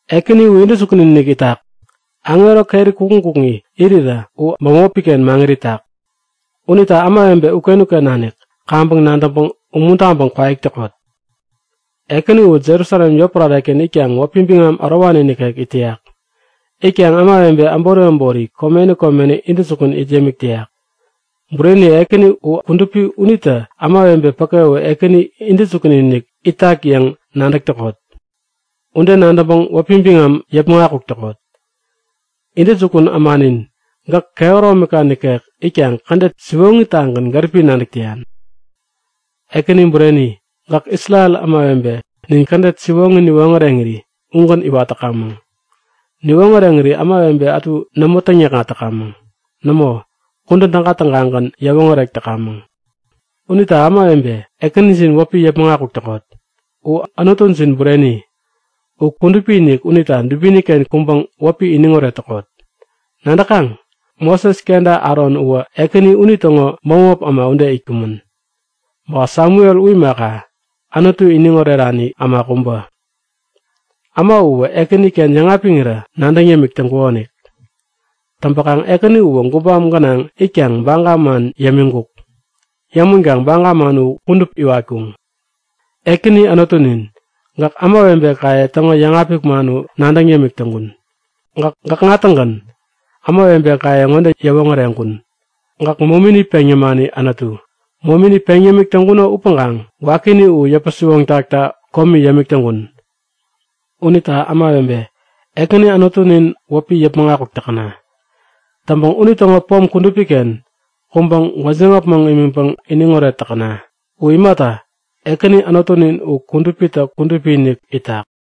Ekäni u intäjukun-inik itak. Aŋero keri kukŋi kukŋi irirä u bämopiken maŋit itak. Unita ämawebe uken-uken nanik kaŋpäŋ nadäŋpäŋ umuntaŋpäŋ kwaik täkot! Ekäni uwä Jerusalem yotpärareken itkaŋ wäpi biŋam ärowani nikek it täyak. Itkaŋ ämawebe äbori äbori komeni komeni intäjukun it yämik täyak. Bureni! Ekäni u kudupi unita ämawebe päke u Ekäni intäjukun-inik itak yäŋ nadäk täkot. Ude nadäŋpäŋ wäpi biŋam yäpmäŋ akuk täkot! Intäjukun ämanin, gäk kehäromika nikek itkaŋ kädet siwoŋitagän gäripi nadäk täyan. Ekäni, bureni, gäk Isrel ämawebe nin kädet siwoŋi niwoŋäreŋiri ugän iwat täkamäŋ. Niwoŋäreŋiri ämawebe ätu nämo täŋyäkŋat täkamäŋ. Nämo, kudän täga-tägagän yäwoŋärek täkamäŋ. Unita ämawebe, Ekänijin wäpi yäpmäŋ akuk täkot! U Anutujin bureni. U kudupi-inik unita dubiniken kuŋpäŋ wäpi iniŋoret täkot! Nadäkaŋ? Moses kenta Aron uwä Ekäni unitäŋo bämop äma ude itkumän. Ba Samuel u imaka, Anutu iniŋ orerani äma kubä. Äma uwä Ekäniken yäŋapiŋirä nadäŋ yämik täŋkukonik. Täŋpäkaŋ Ekäni uwä gubam gänaŋ itkaŋ baga man yämiŋkuk. Yämänkaŋ baga man u kudup iwatkuŋ. Ekäni Anutunin, gäk ämawebekaye täŋo yäŋapik man u nadäŋ yämik täŋkun. Gäk gäkŋa-tägän ämawebekaye ŋode yäwoŋäreŋkun; Gäk momini peŋ yämani Anutu. Momini peŋ yämik täŋkuno upäŋkaŋ wakini u yäpä-siwoŋtakta komi yämik täŋkun. Unita ämawebe, Ekäni Anutunin wäpi yäpmäŋ akuk täkäna! Täŋpäŋ unitäŋo pom kudupiken kuŋpäŋ gwäjiŋ äpmoŋ imiŋpäŋ iniŋoret täkäna. U imata, Ekäni Anutunin u kudupitä kudupi-inik itak.